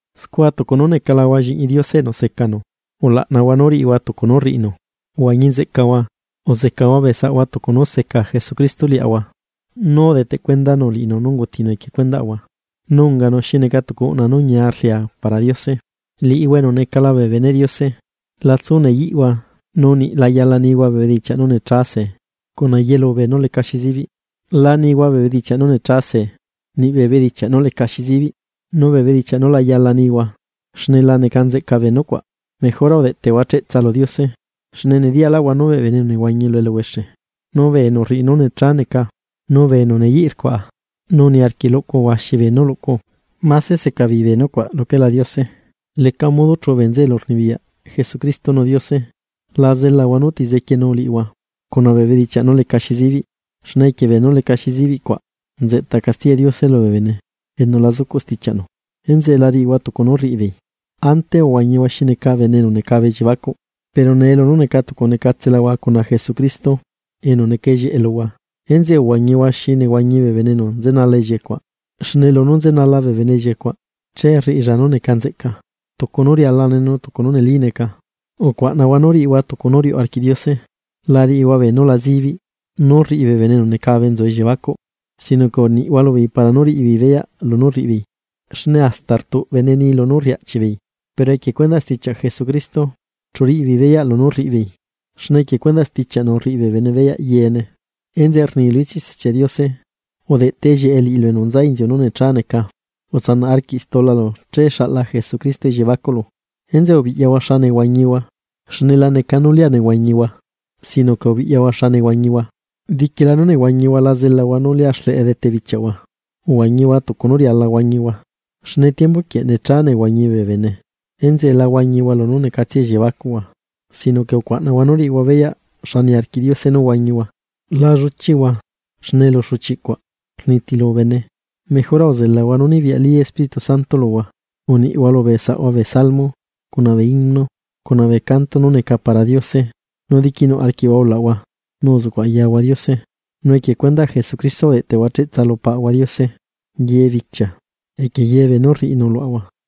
Scua tucu nú necalahua lliꞌñi Diose enu secanu, ulaꞌnahua nú riꞌihua tucu nú rriꞌinu. Huañi nzeꞌcahua, uzecahua bee saꞌhua tucu nú seca Jesucristo liaꞌahua nú udeteꞌ cuendanu liꞌinu nú ungutinu equie cuendaꞌahua, nu unganu xi neca tucu uꞌna nú ñia rlia para Diose. Liꞌihua enu necala bee beneꞌ Diose, la tsu neyiꞌhua nu niꞌ la yala nihua bee bedichiaꞌ nú necha see, cuna yelu beenú lecaxi zibiꞌ. La nihua bee bedichiaꞌ nú necha see, niꞌ bee bedichiaꞌ nú lecaxi zibiꞌ nu bee bedichiaꞌ nú la yala nihua, xne la neca nzeꞌca bee nucuaꞌ. Mejora udeꞌtehua cheꞌtsa lu Diose. Xne nediyaꞌlaꞌhua nú bee bene enu nehuañi lu eluhuexe, nu bee enu rriꞌi nú necha neca, nu bee enu neyiꞌ rcuaꞌa nu niarquiꞌ luꞌcu huaxi beenú luꞌcu, máse seca beei bee nucuaꞌ luquelá Diose, leca modo chuꞌu bee nzeꞌe elurnibiyaꞌ Jesucristo nu Diose. La zelahua nú ti zequienu liꞌihua cuna bee bedichiaꞌ nú lecaxi zibiꞌ, xne equie beenú lecaxi zibiꞌ cuaꞌ nzeꞌta castiyaꞌ Diose lubee bene enu la zucuꞌ stichiaꞌnu. Enzeꞌe la riꞌihua tucu nú rriꞌibeei. Ante uhuañihua xi neca bene enu necabe elliebacuꞌ, pero nee lunú neca tucu necatselahua cuna Jesucristo enu neca ellieꞌe luhua. Enzeꞌe uhuañihua xi nehuañi bee bene enu nzenala ellieꞌe cuaꞌ, xne lunú nzenala bee bene ellieꞌe cuaꞌ, che rriꞌilla nú neca nzeꞌca, tucu nú rialane nu tucu nú neli neca. Ucuaꞌnahua nú riꞌihua tucu nú riuꞌ arquiꞌ Diose. La riꞌihua beenú la zibiꞌ nú rriꞌi bee bene enu necabe nzu elliebacuꞌ, sino que uniꞌhua lubeei para nú riꞌibeei beyaꞌ lunú rriꞌibeei. Xne hasta rtuꞌbene ni lunú rriꞌi aꞌchiꞌbeei. Pero equie cuendaꞌ stichiaꞌ Jesucristo chu riꞌibeei beyaꞌ lunú rriꞌibeei. Xne equie cuendaꞌ stichiaꞌnu rriꞌi bee bene beyaꞌ yeene. Enzeꞌe rni lu ichiꞌ Stichiaꞌ Diose: Udeꞌteꞌ ellieꞌe liꞌilu enu nza inziu nú necha neca, utsanaꞌ arquiꞌ stulalu che xaꞌla Jesucristo elliebacuꞌlu. Enzeꞌe ubiꞌyahua xa nehuañihua, xne la neca nú lia nehuañihua sino que ubiꞌyahua xa nehuañihua. Diquila nú nehuañihua la zelahua nú lia xleꞌe dete bee bichiaꞌhua, uhuañihua tucu nú riala huañihua, xne tiembu quieꞌ necha nehuañi bee bene. Enzeꞌe la huañihua lunú necatsia elliebacuꞌhua, sino que ucuaꞌnahua nú riꞌihua beyaꞌ xa niarquiꞌ Diose nú huañihua. La lluchiꞌhua, xne elu xuchiꞌ cuaꞌ rnitilu bene, mejora uzelahua nú nibiyaꞌli Espíritu Santo luhua. Uniꞌhua lubee saꞌhua bee Salmo, cuna bee himno, cuna bee canto nú neca para Diose, nu diquinuꞌ arquiꞌhua ulaꞌhua nu uzuꞌcuꞌ ayahua Diose. Nu equie cuendaꞌ Jesucristo udeꞌtehua cheꞌtsa lu Paꞌahua Diose ye bichia equie ye beenú rriꞌinu luaꞌahua.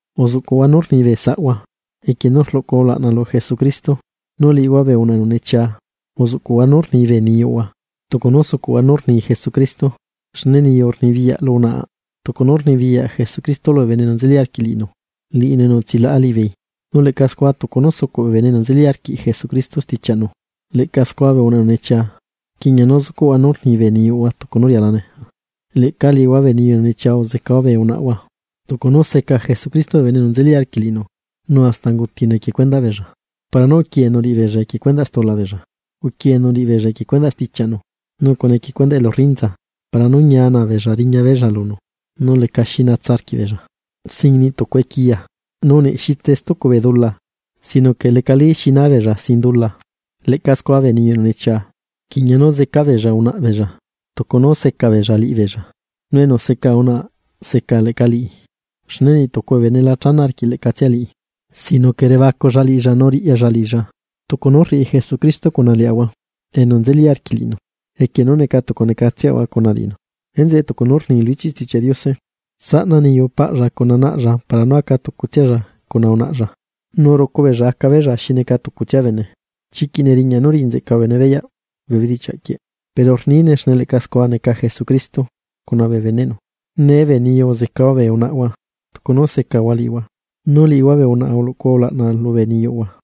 Uzuꞌcuꞌhua nú rni bee saꞌhua equie nú rluꞌcuhua ulaꞌna lu Jesucristo. Nu liꞌihua bee unaꞌa enu nechia uzuꞌcuꞌhua nú rni bee niyuꞌhua, tucu nú sucuꞌhua nú rni Jesucristo. Xne niyu rnibiyaꞌ lu unaꞌi, tucu nú rnibiyaꞌ Jesucristo lubee bene enu nzeli arquiꞌ liꞌinu, liꞌinu enu utsilaꞌa liꞌibeei. Nu leꞌca scua tucu nú sucuꞌ bee bene enu nzeli arquiꞌ Jesucristo stichiaꞌnu, leꞌca scua bee unaꞌa enu nechia rquiꞌña nú zucuꞌhua nú rni bee niyuꞌhua tucu nú rialane. Leꞌca liꞌihua bee niyu enu nechia uzecahua bee unaꞌhua, tucu nú seca Jesucristo bee bene enu nzeli arquiꞌ liꞌinu, nu hasta ungutinu equie cuendaꞌbeella. Para nú uquieenu liꞌibeella lu cuendaꞌ stula beella. Uquieenu liꞌibeella equie cuendaꞌ stichiaꞌnu nu cuna equie cuendaꞌ elu rrinza, para nú ñia naa beella riña beella lunu nu lecaxi na beella, sin niꞌ tucu equiya nu niꞌ xitse stucu bee dula, sino que lecalí xi naa beella sin dula. Leꞌca scua bee niyu enu nechia rquiꞌña nú zeca beella unaꞌa beella, tucu nú seca beella liꞌibeella. Nu enu seca unaꞌa seca leꞌca liꞌi. Xne niꞌ tucu bene la chana arquiꞌ leꞌcatsia liꞌi, sino que rebaculla liꞌilla nu riꞌyalla liꞌilla, tucu nú rriꞌi Jesucristo cuna liaꞌahua enu nzeli arquiꞌ liꞌinu, equie nú neca tucu necatseꞌahua cuna liꞌinu. Enzeꞌe tucu nú rni lu ichiꞌ Stichiaꞌ Diose: “Tsaꞌna niyu paꞌlla cuna naꞌlla para nú aca tucutsialla cuna unaꞌlla, nu rucu beella aca beella xi neca tucutsia bene.” Chiquiꞌ neriñaꞌ nú riꞌi nzeꞌca bee bene beyaꞌ bee bedichiaꞌ quieꞌ, pero rniine xne leꞌca scua neca Jesucristo cuna bee beneꞌnu. Nee bee niyu uzecahua bee unaꞌhua tucu nú secahua liꞌihua, nu liꞌihua bee unaꞌa uluꞌcuhua ulaꞌna lubee niyuꞌhua.